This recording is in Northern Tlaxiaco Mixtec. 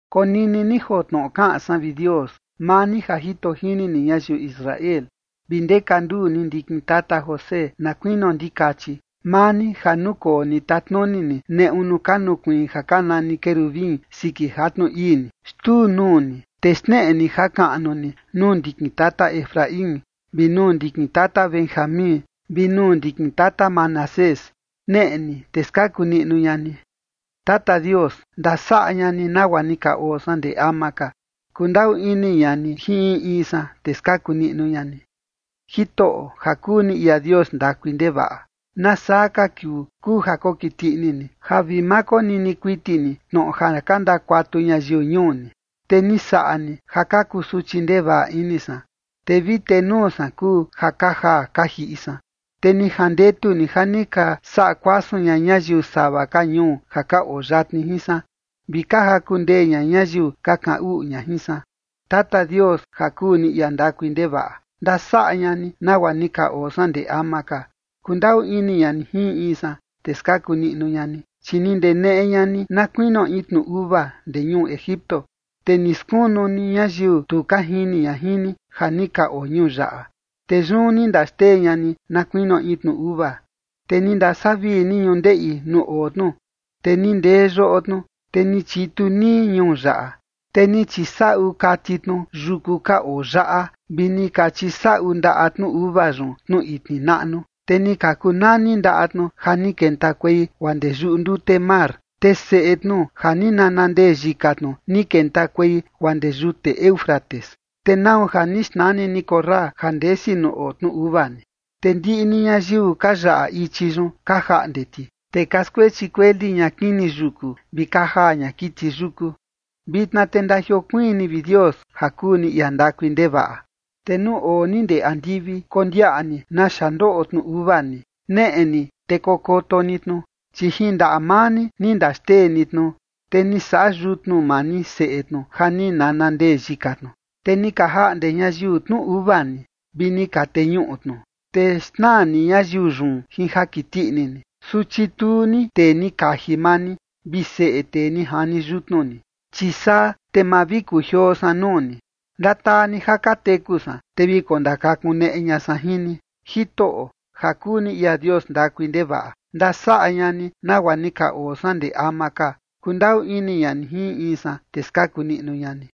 Konini ni joo tnoꞌo kaꞌan san, vi Dios, maa ni ja jito jini ni ñayiu Israel, vi ndeka nduu ni ndikin tata José na kuinio ndikachi, maa ni ja nukoo ni tatnuni ni neꞌu nuu ka nukuiin ja ka nani querubin siki jatnu ii ni. Xtuu nuu ni, te xneꞌe ni jakaꞌnu ni nuu ndikin tata Efraín vi nuu ndikin tata Benjamín, vi nuu ndikin tata Manasés. Neꞌe ni te skaku niꞌnu ña ni. Tata Dios, ndasaꞌa ña ni nagua ni ka oo san ndee ama ka. Kundaꞌu ini ña ni jin in in san, te skaku niꞌnu ña ni. Jitoꞌo ja kuu ni ia Dios ndakui ndevaꞌa, ¿nasaa ka kiuu kuu ja kokiti ini ni ja vi ma konini kuiti ni tnoꞌo ja ka ndakuatu ñayiu ñuu ni? Te ni saꞌa ni ja ka kusuchi ndevaꞌa ini san, te vi tenuu san kuu ja ka jaa ka jiꞌi san. Te ni jandetu ni ja ka saꞌa kuasun ña ñayiu sava ka ñuu ja ka oo yatni jin san, vi ka jaku ndee ña ñayiu ka kaꞌan uꞌu ña jin san. Tata Dios ja kuu ni ia ndakui ndevaꞌa, ndasaꞌa ña ni nagua ni ka oo san ndee ama ka. Kundaꞌu ini ña ni jin in in san, te skaku niꞌnu ña ni. Chi ni ndeneꞌe ña ni na kuinio in tnu uva ndee ñuu Egipto, te ni skunu ni ñayiu tu ka jini ña jin ni, ja ni ka oo ñuu yaꞌa, te yun ni ndaxtee ña ni na kuinio in tnu uva. Te ni ndasavii ni ñundeꞌi nuu oo tnu, te ni ndee yoꞌo tnu, te ni chitu nii ñuu yaꞌa. Te ni chisaꞌu kati tnu yuku ka oo yaꞌa, vi ni ka chisaꞌu ndaꞌa tnu uva yun tnu itni naꞌnu. Te ni ka kuu nani ndaꞌa tnu ja ni kentakuei guaa ndee yuꞌu ndute mar, te seꞌe tnu ja ni nana ndee yika tnu, ni kentakuei guaa ndee yute Éufrates. Te ¿nau ja ni xnani ni korra ja ndesi nuu oo tnu uva ni? Te ndiꞌi ni ñayiu ka yaꞌa ichi yun ka jaꞌnde ti. Te ka skuechi kueli ña kini yuku vi ka jaa ña kiti yuku. Vitna te ndajiokuiin ni, vi Dios, ja kuu ni ia ndakui ndevaꞌa, te nuu oo ni ndee andivi, kondiaꞌa ni naxa ndoꞌo tnu uva ni. Neꞌe ni te kokoto ni tnu. Chi jin ndaꞌa maa ni ni ndaxtee ni tnu, te ni saꞌa yutnu maa ni seꞌe tnu ja ni nana ndee yika tnu. Te ni ka jaꞌnde ñayiu tnu uva ni vi ni ka teñuꞌu tnu. Te xnaa ni ñayiu yun jin ja kiti ini ni. Su chituu ni tee ni kaji maa ni vi seꞌe tee ni jani yutnu ni. Chi saa te ma vi kujioo san nuu ni. Ndataa ni ja ka teku san, te vi kondakakuneꞌe ña san jin ni. Jitoꞌo ja kuu ni ia Dios ndakui ndevaꞌa, ndasaꞌa ña ni nagua ni ka oo san ndee ama ka. Kundaꞌu ini ña ni jin in in san, te skaku niꞌnu ña ni.